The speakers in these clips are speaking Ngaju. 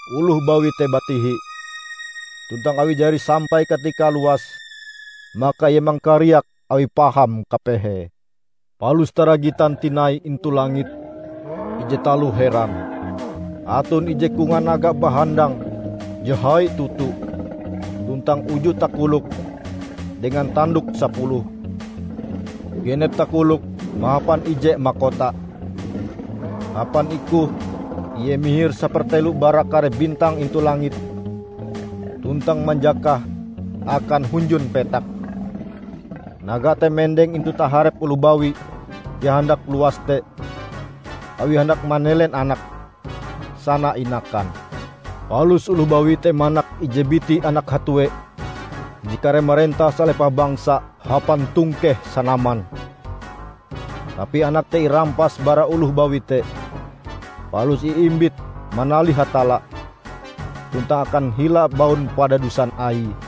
Oloh bawi te batihi, tuntang awi jari sampai katikae luas, maka ie mangkariak awi paham kapehe. Palus taragitan tinai intu langit ije taloh heran. Aton ije kongan naga bahandang je hai toto tuntang uju takoloke dengan tandoke sapuluh. Genep takoloke mahapan ije makota. Hapan ikohe ie mihir sapertelo bara kare bintang intu langit tuntang manjakahe akan hunjun petak. Naga te mendeng intu taharep oloh bawi je handak luas te awie handak manelen anake, sana inakan. Palus oloh bawi te manak ije biti anak hatue je kareh marentah salepah bangsa hapan tongkeh sanaman. Tapi anak te irampas bara oloh bawi te, palus iimbit manalih Hatalla tuntang akan hila baun padadusan Aie.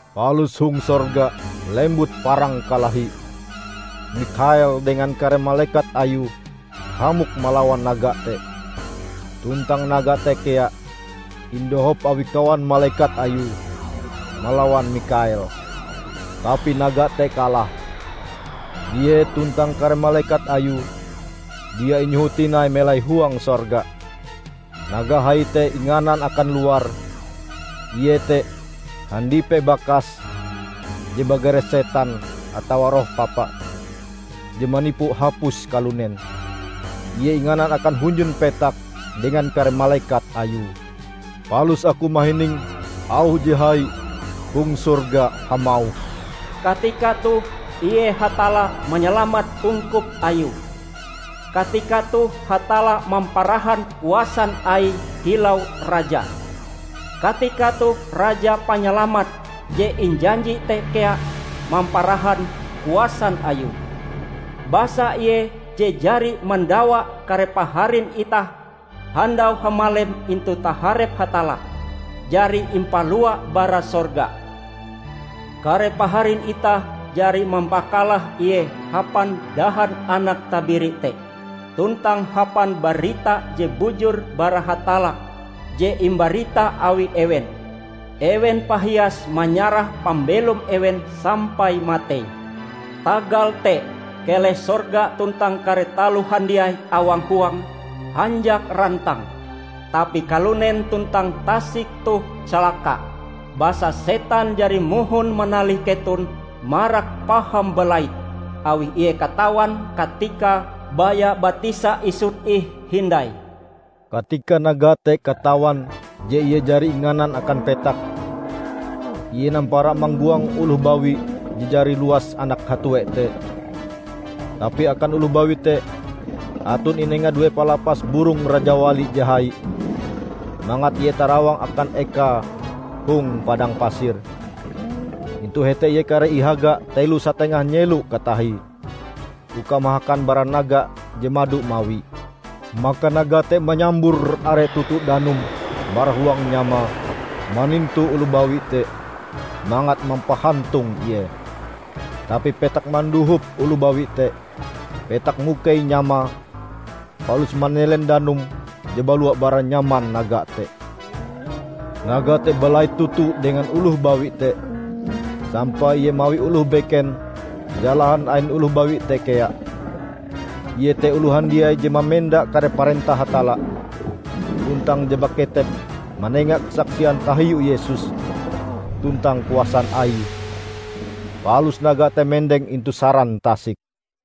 Palus hong sorga lembut parang kalahi. Mikhael dengan kare malekat ayue hamok malawan naga te. Tuntang naga te kea, indohop awi kawan malekat ayue, malawan Mikhael. Tapi naga te kalah. Ie tuntang kare malekat ayue dia inyoho tinai melai huang sorga. Naga hai te inganan akan luar! Ie te handipe bakas je bagare setan atawa Roh Papa, je manipu hapus kalunen. Ie inganan akan hunjun petak dengan kare malekat ayue. Palus aku mahining auh je hai hong sorga hamauh, "Katika toh ie Hatalla manyalamat ungkup Ayue! Katika toh Hatalla mamparahan kuasan Aie kilau Raja! Katika toh Raja Panyalamat je injanji te kea mamparahan kuasan Ayue! Basa ie je jari mandawa kare paharin itah handau hamalem intu taharep Hatalla, jari impalua bara sorga. Kare paharin itah jari mampakalah ie hapan dahan Anak Tabiri te, tuntang hapan barita je bujur bara Hatalla je imbarita awi ewen. Ewen pahias manyarah pambelom ewen sampai matei. Tagal te, keleh sorga tuntang kare taloh handiai awang huange, hanjak rantang! Tapi kalunen tuntang tasik toh calaka, basa setan jari mohon manalih keton marak paham balait, awi ie katawan katikae baya batisa isut ih hindai." Katika naga te katawan je ie jari inganan akan petak, ie nampara manggoang oloh bawi je jari luas anak hatue te. Tapi akan oloh bawi te aton inenga due palapas burong rajawali je hai, mangat ie tarawang akan ekae hong padang pasir, intu hete ie kareh ihaga telo satengah nyelo katahie, uka mahakan bara naga je mado mawi. Maka naga te manyambur are toto danum bara huang nyamae manintu oloh bawi te mangat mampahantung ie. Tapi petak mandohop oloh bawi te; petak mukei nyamae palus manelen danum je balua bara nyaman naga te. Naga te balait toto dengan oloh bawi te, sampai ie mawi oloh beken jalahan ain oloh bawi te kea, iete oloh handiai je mamenda kare parentah Hatalla, tuntang je baketep manenga kasaksian tahiu Yesus tuntang kuasan Aie. Palus naga te mendeng intu saran tasik.